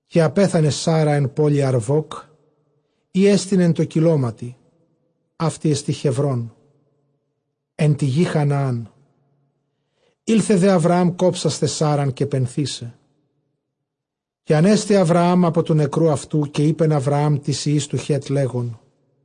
Καὶ ἀπέθανε Σάῤῥα ἐν πόλει Ἀρβὸκ, ἥ ἐστιν ἐν τῷ κοιλώματι· αὕτη ἔστι Χεβρὼν ἐν τῇ γῇ Χαναάν ἦλθε δὲ Ἁβραὰμ κόψασθαι Σάῤῥαν, καὶ πενθῆσαι. Καὶ ἀνέστη Ἁβραὰμ ἀπὸ τοῦ νεκροῦ αὐτοῦ· καὶ εἶπεν Ἁβραὰμ τοῖς υἱοῖς τοῦ Χὲτ, λέγων,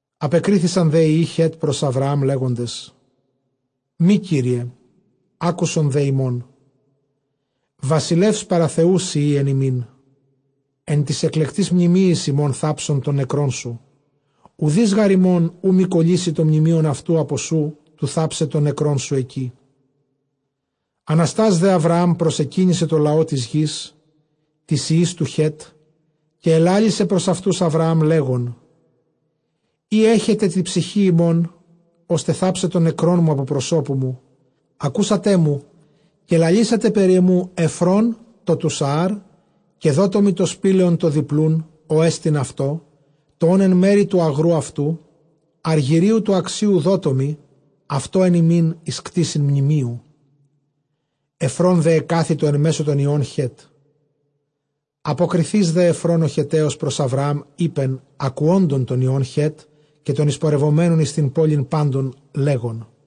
Ἀπεκρίθησαν δὲ οἱ υἱοὶ Χὲτ πρὸς Ἁβραὰμ, λέγοντες, μὴ, κύριε. Ἄκουσον δὲ ἡμῶν· βασιλεὺς παρὰ Θεοῦ σὺ εἶ ἐν ἡμῖν· ἐν τοῖς ἐκλεκτοῖς μνημείοις ἡμῶν θάψον τὸν νεκρόν σου· οὐδεὶς γὰρ ἡμῶν οὐ μὴ κωλύσει τὸ μνημεῖον αὐτοῦ ἀπὸ σοῦ, τοῦ θάψαι τὸν νεκρόν σου ἐκεῖ. Ἀναστὰς δὲ Ἁβραὰμ προσεκύνησε τῷ λαῷ τῆς γῆς, τοῖς υἱοῖς τοῦ Χέτ. Καὶ ἐλάλησε πρὸς αὐτοὺς Ἁβραὰμ, λέγων, εἰ ἔχετε τῇ ψυχῇ ὑμῶν, ὥστε θάψαι τὸν νεκρόν μου ἀπὸ προσώπου μου, ἀκούσατέ μου, καὶ λαλήσατε περὶ ἐμοῦ Ἐφρὼν τῷ τοῦ Σαάρ. Καὶ δότω μοι τὸ σπήλαιον τὸ διπλοῦν, ὅ ἐστιν αὐτῷ, τὸ ὂν ἐν μέρει τοῦ ἀγροῦ αὐτοῦ· ἀργυρίου τοῦ ἀξίου δότε μοι αὐτὸ ἐν ὑμῖν εἰς κτῆσιν μνημείου. Ἐφρὼν δὲ ἐκάθητο ἐν μέσῳ τῶν υἱῶν Χέτ· ἀποκριθεὶς δὲ Ἐφρὼν ὁ Χετταῖος πρὸς Ἁβραὰμ εἶπεν, ἀκουόντων τῶν υἱῶν Χὲτ, καὶ τῶν εἰσπορευομένων εἰς τὴν πόλιν πάντων, λέγων,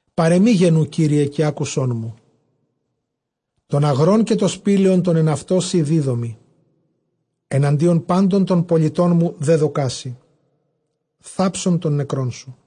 Παρʼ ἐμοὶ γενοῦ, κύριε, καὶ ἄκουσόν μου· τὸν ἀγρὸν, καὶ τὸ σπήλαιον τὸ ἐν αὐτῷ, σοὶ δίδωμι· ἐναντίον πάντων τῶν πολιτῶν μου δέδωκά σοι· θάψον τὸν νεκρόν σου.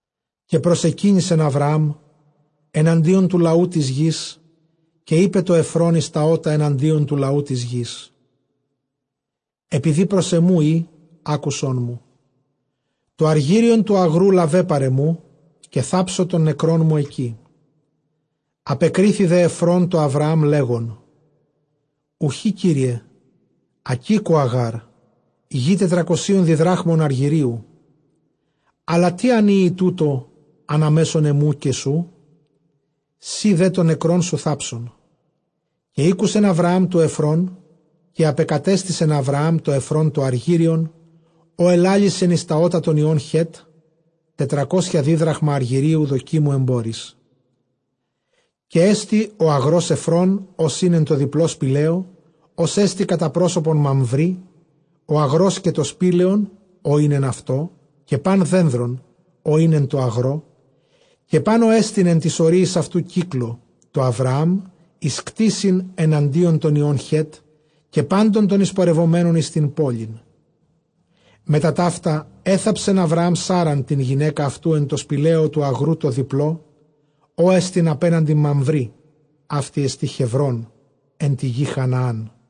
Καὶ προσεκύνησεν Ἁβραὰμ ἐναντίον τοῦ λαοῦ τῆς γῆς. Καὶ εἶπε τῷ Ἐφρὼν εἰς τὰ ὦτα ἐναντίον τοῦ λαοῦ τῆς γῆς, ἐπειδὴ πρὸς ἐμοῦ εἶ, ἄκουσόν μου· τὸ ἀργύριον τοῦ ἀγροῦ λάβε παρʼ ἐμοῦ, καὶ θάψω τὸν νεκρόν μου ἐκεῖ. Ἀπεκρίθη δὲ Ἐφρὼν τῷ Ἁβραὰμ, λέγων, Οὐχὶ, κύριε· ἀκήκοα γὰρ, γῆ τετρακοσίων διδράχμων ἀργύριου· ἀλλὰ τί ἂν εἴη τοῦτο ἀνὰ μέσον ἐμοῦ καὶ σοῦ; σὺ δὲ τὸν νεκρόν σου θάψον. καὶ ἤκουσεν Ἁβραὰμ τοῦ Ἐφρών· καὶ ἀπεκατέστησεν Ἁβραὰμ τῷ Ἐφρὼν τὸ ἀργύριον, ὃ ἐλάλησεν εἰς τὰ ὦτα τῶν υἱῶν Χὲτ, τετρακόσια δίδραχμα ἀργυρίου δοκίμου ἐμπόροις. Καὶ ἔστη ὁ ἀγρὸς Ἐφρών, ὃς ἦν ἐν τῷ διπλῷ σπηλαίῳ, ὅς ἐστι κατὰ πρόσωπον Μαμβρῆ, ὁ ἀγρὸς καὶ τὸ σπήλαιον, ὃ ἦν ἐν αὐτῷ, καὶ πᾶν δένδρον, ὃ ἦν ἐν τῷ ἀγρῷ, καὶ πᾶν ὅ ἐστιν ἐν τοῖς ὁρίοις αὐτοῦ κύκλῳ, τῷ Ἁβραὰμ, εἰς κτῆσιν ἐναντίον τῶν υἱῶν Χὲτ, καὶ πάντων τῶν εἰσπορευομένων εἰς τὴν πόλιν. Μετὰ ταῦτα ἔθαψεν Ἁβραὰμ Σάῤῥαν τὴν γυναῖκα αὐτοῦ ἐν τῷ σπηλαίῳ τοῦ ἀγροῦ τῷ διπλῷ, ὅ ἐστιν ἀπέναντι Μαμβρῆ· αὕτη ἐστὶ Χεβρὼν ἐν τῇ γῇ Χαναάν.